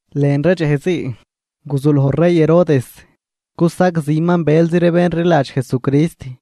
Lën ree dxej zii guzuloj rey Herodes cusagziman bëlzi ree bén rliladx Jesucrist.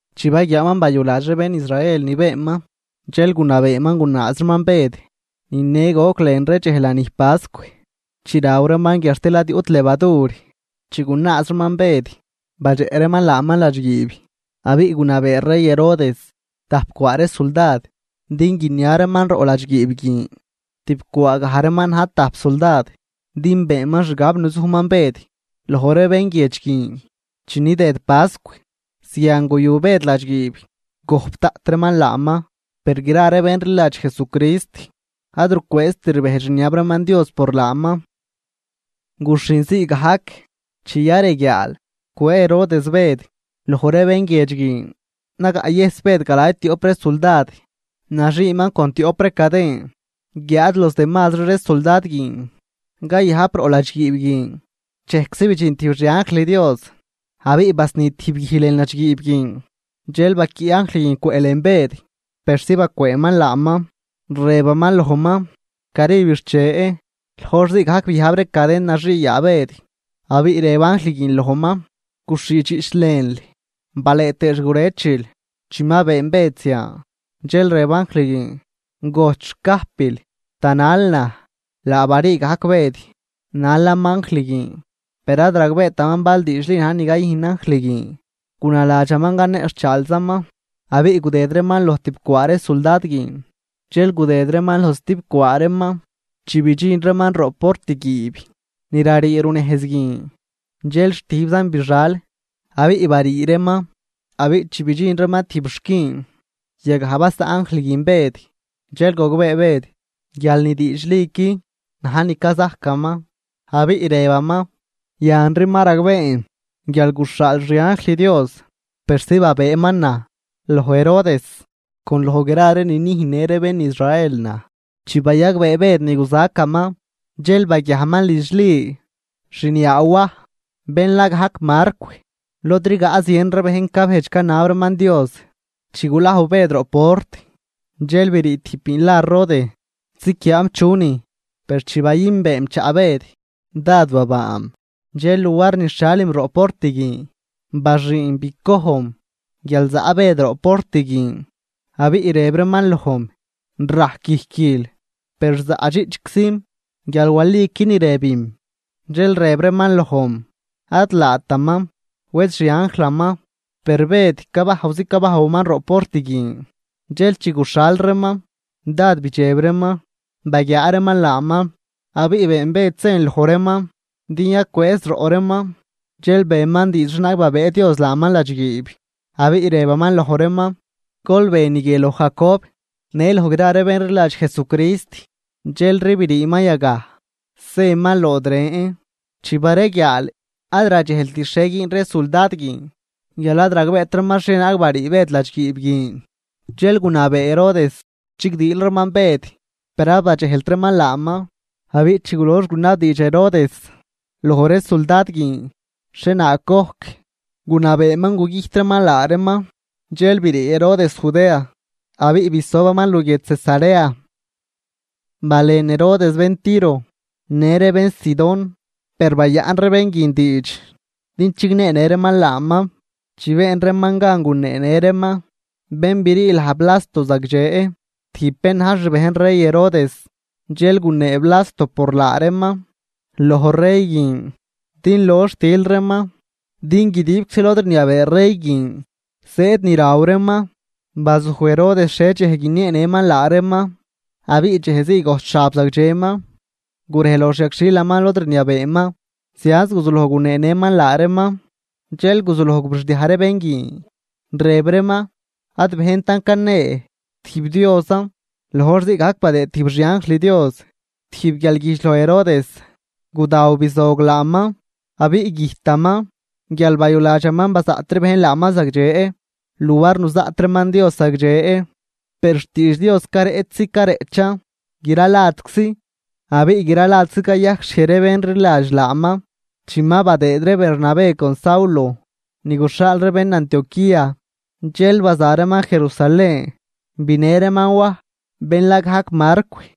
Chi baguiaaman bayuladx ree bén Israel ni beenman, dxel gunabeeman gunaaz reeman Bëd. Ni ne goc lën ree dxej lanij pascw chi raw reeman guiadxtil ad yuꞌt levadur. Chi gunaaz reeman Bëd, badxeꞌ reeman laaman ladxguiib abiꞌ gunabee rey Herodes tajp cwaa ree suldad din guinia reeman roꞌ ladxguiib guin, tib cwaa gaj reeman na̱j tajp suldad. Din beenman xgab nuzujman Bëd loj ree bén guiedx guin chi nidëd pascw. Zian guyu Bëd ladxguiib, gojp daꞌt reeman laaman. Per gra ree bén rliladx Jesucrist ad rucwëëzt rbejdx rniab reeman Dios por laaman. Guxhin zii gajc chi yareguiaal cwëë Herodes Bëd loj ree bén guiedx guin, nagaꞌyëjs Bëd galay tioꞌp ree suldad, naxiiman con tioꞌp ree caden, guiáad los demazri ree suldad guin cayajp roꞌ ladxguiib guin. Dxejczi bidxin tijb xi anjl Dios abiꞌ basni tijb guij lën ladxguiib guin, dxel baquiꞌ anjl guin cwëꞌlën Bëd persi bacwëënman laaman, rëbaman lojman: ―¡Cari bixche! Loj hor zii gajc biajb ree caden naxii yaa Bëd, abiꞌ rëb anjl guin lojman: ―Guxhiidxiꞌch lënl balëë tëë xgurëchil. Chi ma been Bëd zian dxel rëb anjl guin: ―¡Gojt xcajpil, tanal naj! Laa barii gajc Bëd nalaman anjl guin, per ad ragbeetaman bal diidxli na̱j ni cayüjn anjl guin, gunaladxaman caneꞌxhchaalzaman. Abiꞌ gudëd reeman loj tibcwaa ree suldad guin, dxel gudëd reeman loj stibcwaa reeman. Chi bidxin reeman roꞌ portguiib ni rarii runejz guin, dxel xtijbzan bixal abiꞌ barii reeman. Abiꞌ chi bidxin reeman tijb xquin, yagaj basaꞌn anjl guin Bëd. Dxel gogbee Bëd guial ni diidxliqui na̱j ni cazajcaman, abiꞌ rëbaman: ―Yanri ma ragbeen guial guxhaal xi anjl Dios persi babëëman naj loj Herodes, con loj gra ni nüjnnë ree bén Israel naj. Chi bayagbee Bëd ni guzacaman, dxel baguiajman lidx Li, xniaa Waj, bén la gajc Marcw, lod rigaꞌ zien ree bejn cabejdx canab reeman Dios. Chi gulajw Bëd roꞌ port, dxel brii tijb biin la Rode ziquiaam chunin. Per chi bayünbeem chaꞌ Bëd, dád babaam, dxel luar nixhialim roꞌ port guin, baxüünm bicojnm guial zaꞌ Bëd roꞌ port guin. Abiꞌ rëb reeman lojm: ―¡Rajc guijquil! Per zaꞌdxiꞌchczim guial waliqui ni rëbim. Dxel rëb reeman lojm: ―Ad laataman, wed xi anjlaman. Per Bëd cabajwzi cabajwaman roꞌ port guin. Dxel chi guxhal reeman dád bidxeb reeman baguiaa reeman laaman. Abiꞌ been Bëd sen loj reeman din yacwëëz roꞌ reeman, dxel beman diidx xhienaag babëë Dios laaman ladxguiib. Abiꞌ rëbaman loj reeman: ―Gol be ni guie loj Jacob në loj gra ree bén rliladx Jesucrist. Dxelri briiman yagaj zëman lood ren. Chi bareguiaal, ad radxejlt xhie güün ree suldad guin guial ad ragbeet reeman xhienaag barii Bëd ladxguiib guin. Dxel gunabee Herodes chigdiil reeman Bëd, per ad badxejlt reeman laaman. Abiꞌ chi gulox gunabdiidx Herodes loj ree suldad guin xhienaag gojc, gunabeeman gugüjt reeman laa reeman. Dxel brii Herodes Judea abiꞌ bisobaman luguiedx Cesarea. Balen Herodes bén Tiro në ree bén Sidón, per bayaꞌn ree bén guin diidx din chigneenë reeman laaman. Chi been reeman gan guneenë reeman bén brii laj Blasto zagdxe, tijb bén na̱j xbejn rey Herodes, dxel gunee Blasto por laa reeman loj rey guin din lox til reeman, din guidibczi lod rniabee rey guin zëëd ni raw reeman. Bazuj Herodes xhie dxej guinieenëman laa reeman abiꞌ dxej zii gojt xab zagdxeman, gurej loj xyagxhilaman lod rniabeeman, zianz guzuloj guneenëman laa reeman. Dxel guzuloj gurixdiaj ree bén guin, rëb reeman: ―¡Ad bejntan canee, tijb diosan! Loj hor zii gajc badëë tijb xi anjl Dios tijb guialguijdx loj Herodes. Gudaw bizog laaman abiꞌ güjtaman guial bayuladxaman bazaꞌt ree bejn laaman zagdxe luar nuzaꞌt reeman Dios zagdxe. Per xtiidx Dios careꞌchzi careꞌchan gra ladczi abiꞌ gra ladczi cayajcxhiej ree bén rliladx laaman. Chi ma badëëd ree Bernabé con Saulo ni guxhaal ree bén Antioquía, dxel baza reeman Jerusalén, binë reeman Waj, bén la gajc Marcw.